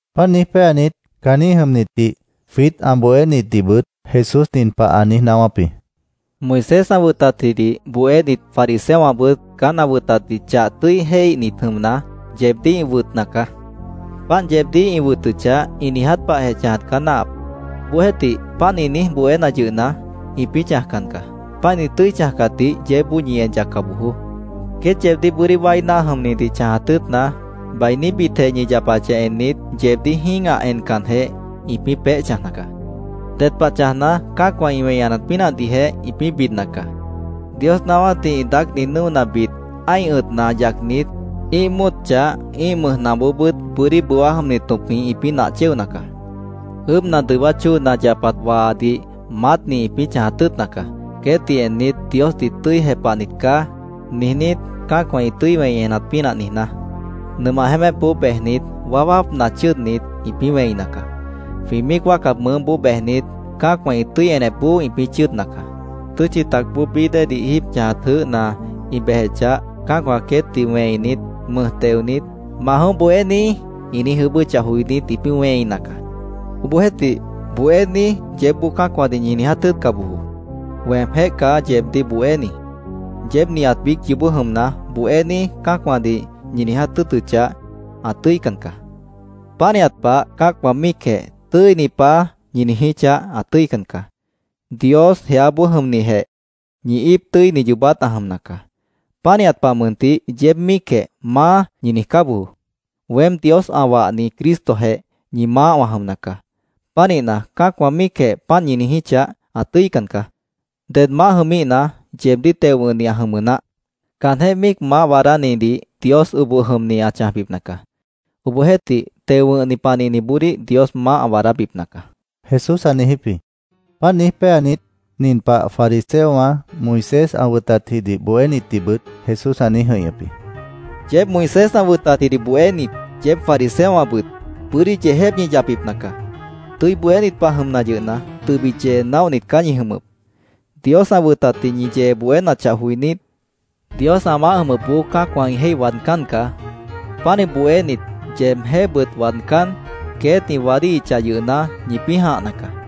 Páant niíj péanit, caanjĩ́h jʉmnitdih, jwiít ã bohénitdihbʉt Jesús nin pah ã niíj naáwáp jĩ: “Moisés ã wʉtatjidih bohénit, fariseowãbʉt caán ã wʉtatdih chah tʉ́i jéihnit jʉmna, yeebdíh ĩ wʉtna caá. Páant yeebdíh ĩ wʉtʉchah, ĩ niiját pahjeh chãjat caá náahap. Obohjeéhtih, páant ĩ niíj bohéna yʉhna, ĩpĩ́ chãjcan caá. Páant ĩ tʉ́i chãjcatdih yeébboó ñi en yacca bojoó. Queét yeebdíh bʉ́dí wái náah jʉmnidih chãjat tʉ́ʉtna, bainíbitjeh ñi yapachah ennit, yeebdíh jĩ́gah encanjeh, ĩpĩ́ peéh chãjna caá. Ded pah chãjna, cã́acwã ĩ wẽi enat pínahdihjeh ĩpĩ́ bidna caá. Dios naáwátdih ĩ daácni nʉ́onabit ã́ih ʉ̃tna yacnit, ĩ́ih móot chah, ĩ́ih mʉj nahboobʉ́t bʉ́dí bʉwá jʉmni tõpjĩh ĩpĩ́ nah chéona caá. Ʉʉ́bhna dʉwát chóona ã yapat waanadih maátni ĩpĩ́ chãjat tʉ́ʉtna caá, queétdih ennit, ‘Diosdih tʉ́i jepahnit caá’, niijnít, cã́acwã ĩ tʉ́i wẽi enat pínah niijná. Nʉmah jeémépboó bejnit, waáwápna chʉ́ʉdnit, ĩpĩ́ wẽina caá. Jwĩ míic wáacat mʉʉ́boó bejnit, cã́acwã ĩ tʉ́i enepboó ĩpĩ́ chʉ́ʉdna caá. Tʉ́tchi tacboó bií déedih jíib chãjat jʉʉ́hna ĩ bejechah, cã́acwã queétdih wẽinit, mʉj teonit, ‘Ma jʉ̃óh, Bohéní’, ĩ niíj ʉʉ́bʉ́chah joinít, ĩpĩ́ wẽina caá. “Obohjeéhtih, ‘Bohéní’, yeébboó cã́acwãdih ñi niiját tʉ́ʉtca bojoó. Weemjéh caá yeebdíh bohéni. Yeéb nihat biíc yoobó jʉmna, ‘Bohéní’, cã́acwãdih ñi niiját tʉ́ʉtʉchah, ã tʉ́ican caá. Pánihat pah, cã́acwã míicjeh ‘Tʉ́ini Paá’, ñi niijíchah, ã tʉ́ican caá. Dios, jeáboó jʉmnijeh, ñi íip tʉ́ini yoobát ã jʉmna caá. Pánihat pah mʉntih, yeéb míicjeh ‘Maá’, ñi niijcá bojoó. Weém, Dios ã wahni Cristojeh, ñi maáh wã jʉmna caá. Pánihna, cã́acwã míicjeh páant ñi niijíchah, ã tʉ́ican caá. Ded maáh jʉmíhna, yeebdíh teo wʉ̃hni ã jʉmʉ naáh. Caanjéh míic maáh waadánidih Dios oboh jʉmni ã chãjbipna caá. Obohjeéhtih, teo wʉ̃hni panihniboodíh Dios maáh ã waadábipna caá”, Jesús ã niijíp jĩ. Páant niíj péanit, nin pah fariseowã, Moisés ã wʉtatjidih bohénitdihbʉt Jesús ã niíj jʉ̃ihñʉp jĩ: “¡Yeéb Moisés ã wʉtatjidih bohénit, yeéb fariseowãbʉt bʉ́dí yeejép ñi yapbipna caá! Tʉ́i bohénit pah jʉmna yʉhna, tʉbit yee naóhnit caá ñi jʉmʉp. Dios ã wʉtatdih ñi yee bohénachah joinít, Dios ã maáh jʉmʉpboó cã́acwã ĩ jéih waadcán caá. Pánih bohénit, yeebjéhbʉt waadcán, queét ĩ waádíhichah yʉhna, ñipĩ́ jãhna caá.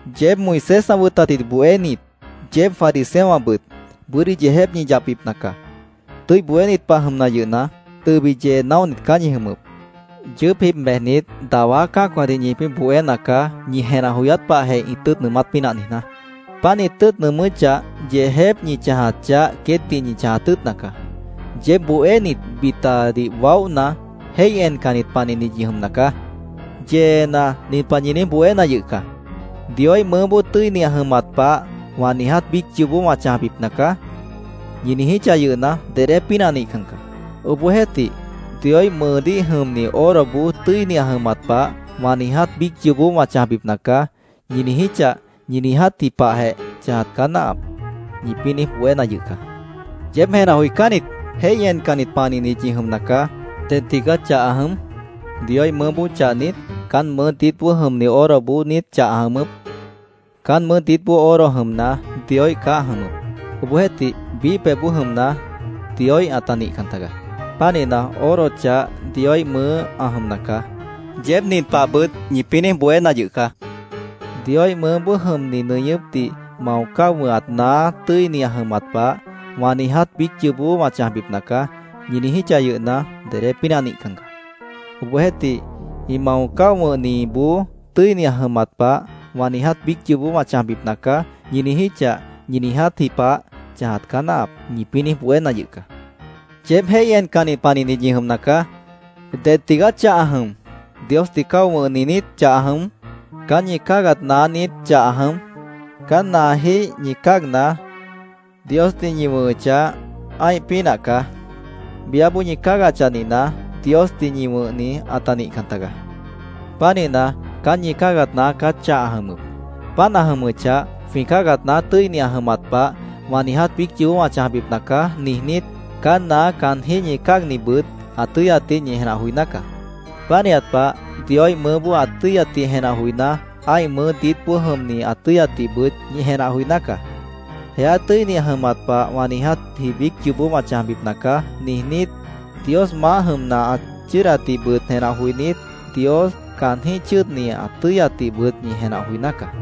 “¡Yeéb Moisés ã wʉtatjidih bohénit, yeéb fariseowãbʉt bʉ́dí yeejép ñi yapbipna caá! Tʉ́i bohénit pah jʉmna yʉhna, tʉbit yee naóhnit caá ñi jʉmʉp. Yʉʉ́p jib bejnit, dawá cã́acwãdih ñipĩ́ bohéna caá, ñi jenah joyát pahjeh ĩ tʉ́ʉt nʉʉmát pínah niijná. Páant ĩ tʉ́ʉt nʉʉmʉ́chah, yeejép ñi chãjat chah queétdih ñi chãjat tʉ́ʉtna caá. “¡Yeéb bohénit, bitadih waóhna, jéih encannit panihnit ñi jʉmna caá! Yeena, nin pah ñi niíj bohéna yʉh caá: ‘ “Dioíh mʉʉ́ tʉ́ini ã jʉmat pah, wã niiját biíc yoobó wã chãjbipna caá”, ñi niijíchah yʉhna, dedé pínah nihcan caá. Obohjeéhtih, “Dioíh mʉʉdíh jʉmni oroboó tʉ́ini ã jʉmat pah, wã niiját biíc yoobó wã chãjbipna caá”, ñi niijíchah, ñi niijátji pahjeh chãjat caá náahap’, ñipĩ́ niíj bohéna yʉh caá. ¡Yeéb jenah joicánnit, jéih encannit panihnit ñi jʉmna caá! ¿Ded tigaá chah ã jʉm? ¿Dioíh mʉʉ́ chah niít? ¿Caán mʉʉ́ diítboó jʉmni oroboó niít chah ã jʉmʉp? Caán mʉʉ́ diítboó oro jʉmna, Dioíh caá ã jʉmʉp. Obohjeéhtih, biíh pebhboó jʉmna, Dioíh ãta nihcan taga. Pánihna, oro chah Dioíh mʉʉ́ ã jʉmna caá. Yeéb nin pahbʉt ñipĩ́ niíj bohéna yʉh caá: ‘ “Dioíh mʉʉ́boó jʉmni nʉñʉ́pdih mao cáo wʉ̃hat naá tʉ́ini ã jʉmat pah, wã niiját biíc yoobó wã chãjbipna caá”, ñi niijíchah yʉhna, dedé pínah nihcan caá. Obohjeéhtih, “Ĩ mao cáo wʉ̃hniboó tʉ́ini ã jʉmat pah, wã niiját biíc yoobó wã chãjbipna caá”, ñi niijíchah, ñi niijátji pah chãjat caá náahap’, ñipĩ́ niíj bohéna yʉh caá. ¡Yeéb jéih encannit panihnit ñi jʉmna caá! ¿Ded tigaá chah ã jʉm? ¿Diosdih cáo wʉ̃hni niít chah ã jʉm? ¿Caán ñi cáagat naá niít chah ã jʉm? Caán naajíh ñi cáagna, Diosdih ñi wʉ̃hʉchah, ã́ih pínah caá. Biáboó ñi cáagachah nihna, Diosdih ñi wʉ̃hni ãta nihcan tagaá. Pánihna, caán ñi cáagat naá caá chah ã jʉmʉp. Páant ã jʉmʉchah, ‘Jwĩ cáagat naá tʉ́ini ã jʉmat pah, wã niijátji biíc yoobó wã chãjbipna caá’, niijnít, caán naá caanjíh ñi cáagnibʉt ã tʉ́yatdih ñi jenah joiná caá. Pánihat pah, Dioíh mʉʉ́ ã tʉ́yatdih jenah joiná, ã́ih mʉʉ́ diítboó jʉmni ã tʉ́yatdihbʉt ñi jenah joiná caá. ‘Jeá tʉ́ini ã jʉmat pah, wã niijátji biíc yoobó wã chãjbipna caá’, niijnít, Dios maáh jʉmna ã chʉ́ʉdatdihbʉt jenah joinít, Dios, caanjíh chʉ́ʉdni ã tʉ́yatdihbʉt ñi jenah joiná caá.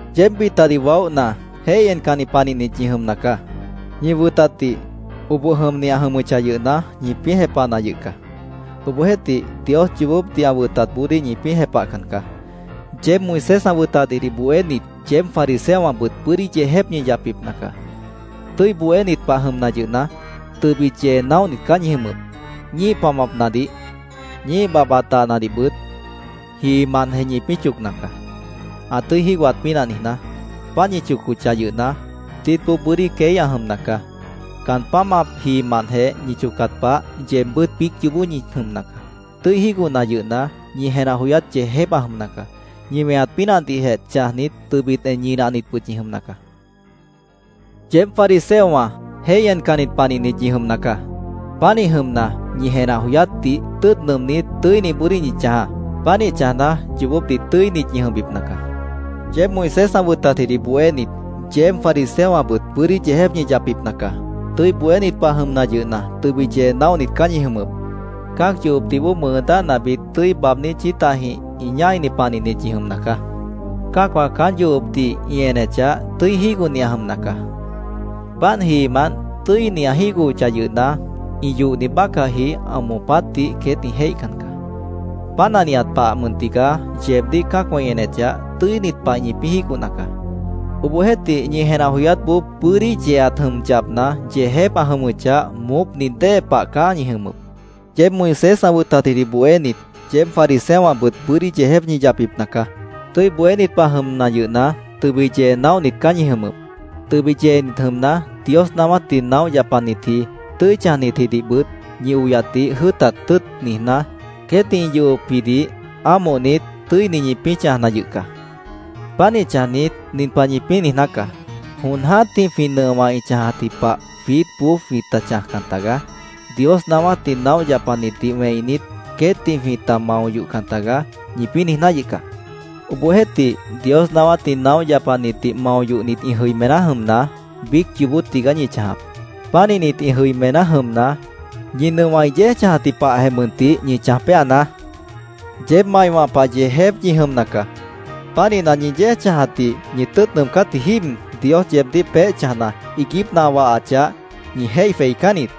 ¡Yeéb bitadih waóhna, jéih encannit panihnit ñi jʉmna caá! Ñi wʉtatdih, oboh jʉmni ã jʉmʉchah yʉhna, ñipĩ́ jepahna yʉh caá. Obohjeéhtih, Dios yoobópdih ã wʉtatboodíh ñipĩ́ jepahcan caá. “¡Yeéb Moisés ã wʉtatjidih bohénit, yeéb fariseowãbʉt bʉ́dí yeejép ñi yapbipna caá! Tʉ́i bohénit pah jʉmna yʉhna, tʉbit yee naóhnit caá ñi jʉmʉp. Ñíih pamapnadih, ñíih babhbat dahnadihbʉt jiimantjeh ñipĩ́ chocna caá, ã tʉ́i jígohat pínah niijná. Páant ñi chocochah yʉhna, diítboó bʉ́dí queí ã jʉmna caá. Caan pámap jiimantjeh ñi chocat pah, yeebbʉ́t biíc yoobó ñi jʉmna caá. Tʉ́i jígohna yʉhna, ñi jenah joyát yeejép ã jʉmna caá. Ñi weñat pínahdihjeh chãjnit, tʉbit en ñinahnitbʉt ñi jʉmna caá. ¡Yeéb fariseowã jéih encannit panihnit ñi jʉmna caá! Pánih jʉmna, ñi jenah joyátdih tʉ́ʉt nʉʉmnít, tʉ́iniboodíh ñi chãjaá. Pánih chãjna, yoobópdih tʉ́init ñi jʉmbipna caá. “¡Yeéb Moisés ã wʉtatjidih bohénit, yeéb fariseowãbʉt bʉ́dí yeejép ñi yapbipna caá! Tʉ́i bohénit pah jʉmna yʉhna, tʉbit yee naóhnit caá ñi jʉmʉp. Cã́ac yohopdih bóo mʉʉ dáhnabit tʉ́i baabní chítahjĩh ĩ ñáini panihnit ñi jʉmna caá. Cã́acwã caán yohopdih ĩ enechah, tʉ́i jígohni ã jʉmna caá. Páant jiimant tʉ́ini ã jígohochah yʉhna, ĩ yohni bácahji ã moopátdih queét ĩ jéih encan caá. Páant ã nihat pahjeh mʉn tigaá yeebdíh cã́acwã ĩ enechah, tʉ́init pah ñipĩ́ jígohna yʉh caá. Obohjeéhtih, ñi jenah joyátboó bʉ́dí yeeat jʉm yapna, yeejép ã jʉmʉchah, moópni dée pah caá ñi jʉmʉp. “¡Yeéb Moisés ã wʉtatjidih bohénit, yeéb fariseowãbʉt bʉ́dí yeejép ñi yapbipna caá! Tʉ́i bohénit pah jʉmna yʉhna, tʉbit yee naóhnit caá ñi jʉmʉp. Tʉbit yeenit jʉmna, Dios naáwátdih naóh yapanitji, tʉ́i chãjnitjidihbʉt ñi oyatdih jʉ́ʉtat tʉ́ʉt niijná, queétdih ĩ yohopjidih ámohnit, tʉ́ini ñipĩ́ chãjna yʉh caá. Pánih chãjnit, nin pah ñipĩ́ niijná caá: ‘Jon jã́tih jwĩ nʉowã ĩ chãjatji pah jwiítboó jwĩta chãjcan tagaá. Dios naáwátdih naóh yapanitdih wẽinit, queétdih jwĩta mao yohcan tagaá’, ñipĩ́ niijná yʉh caá. Obohjeéhtih, Dios naáwátdih naóh yapanitdih mao yohnit ĩ jʉimená jʉmna, biíc yoobó tigaá ñi chãjap. Pánihnit ĩ jʉimená jʉmna, ñi nʉowã ĩ yéej chãjatji pahjeh mʉntih ñi chãj péanaá. “¡Yeéb maiwã pah yeejépwã ñi jʉmna caá! Pánihna, ñi yéej chãjatdih ñi tʉ́ʉt nʉʉmcátji jíib, Dios yeebdíh peéh chãjna, iiguípna ã wahachah, ñi jéih jweicán niít.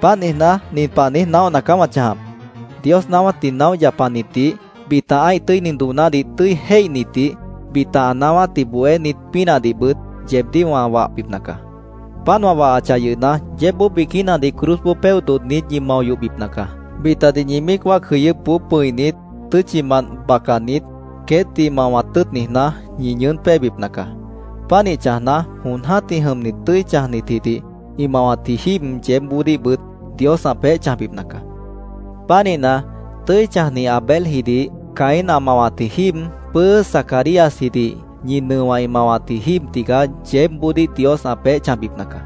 Páant niijná, nin pah niíj naóhna caá wã chãjap: Dios naáwátdih naóh yapanitdih, bita ã́ih tʉ́ini doonádih tʉ́i jéihnitdih, bita ã naáwátdih bohénit pínahdihbʉt yeebdíh wã wahbipna caá. Páant wã wahachah yʉhna, yeébboó biquínadih cruzboó péoh dodhnit ñi mao yohbipna caá. Bitadih ñi míic wáac jʉyʉ́pboó pʉ̃init, tʉ́tchimant bacanit, queétdih mawat tʉ́ʉt niijná, ñi ñʉʉ́n péebipna caá. Pánih chãjna, jon jã́tih jʉmnit tʉ́i chãjnitjidih ĩ mawatji jíib yeébboodíhbʉt Dios ã peéh chãjbipna caá. Pánihna, tʉ́i chãjni Abeljidih Caín ã mawatji jíib pʉ́ʉ́ʉ́ʉ́ Zacaríasjidih ñi nʉowã ĩ mawatji jíib tigaá yeébboodíh Dios ã peéh chãjbipna caá.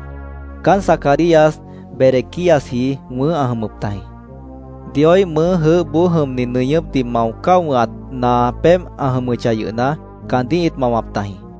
Caán Zacarías Berequíasji wʉ̃ʉ́h ãt jʉmʉp tajĩ. Dioíh mʉʉ́ jʉʉ́hboó jʉmni nʉñʉ́pdih mao cáo wʉ̃hat naa pébh ã jʉmʉchah yʉhna, caandíh ĩt mawap tajĩ.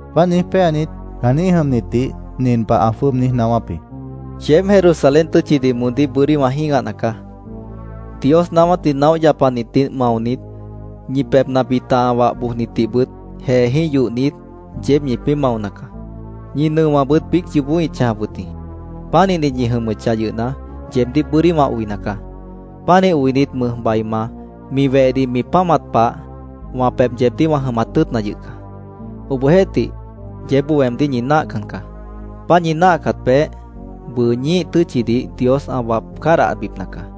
Páant niíj péanit, caanjĩ́h jʉmnitdih nin pah ã jwʉ́ʉb niíj naáwáp jĩ: “¡Yeéb Jerusalén tʉ́tchidih moondíh bʉ́dí wã jĩ́gahna caá! Dios naáwátdih naóh yapanitdih maonit, ñi pebhna bita ã wah bojnitdihbʉt jeejĩ́h yohnit, yeéb ñipĩ́ maona caá. Ñi nʉowãbʉt biíc yoobó ĩt chãjap wʉt jĩ. Pánihnit ñi jʉmʉchah yʉhna, yeebdíh bʉ́dí wã oina caá. Pánih oinit, mʉjbaima mi wehdih mi páamat pah, wã pebh yeebdíh wã jʉmat tʉ́ʉtna yʉh caá. Obohjeéhtih, yeébboó weemdíh ñi náahcan caá. Páant ñi náahcat peéh, bʉʉ ñíih tʉ́tchidih Dios ã wap cádahbipna caá.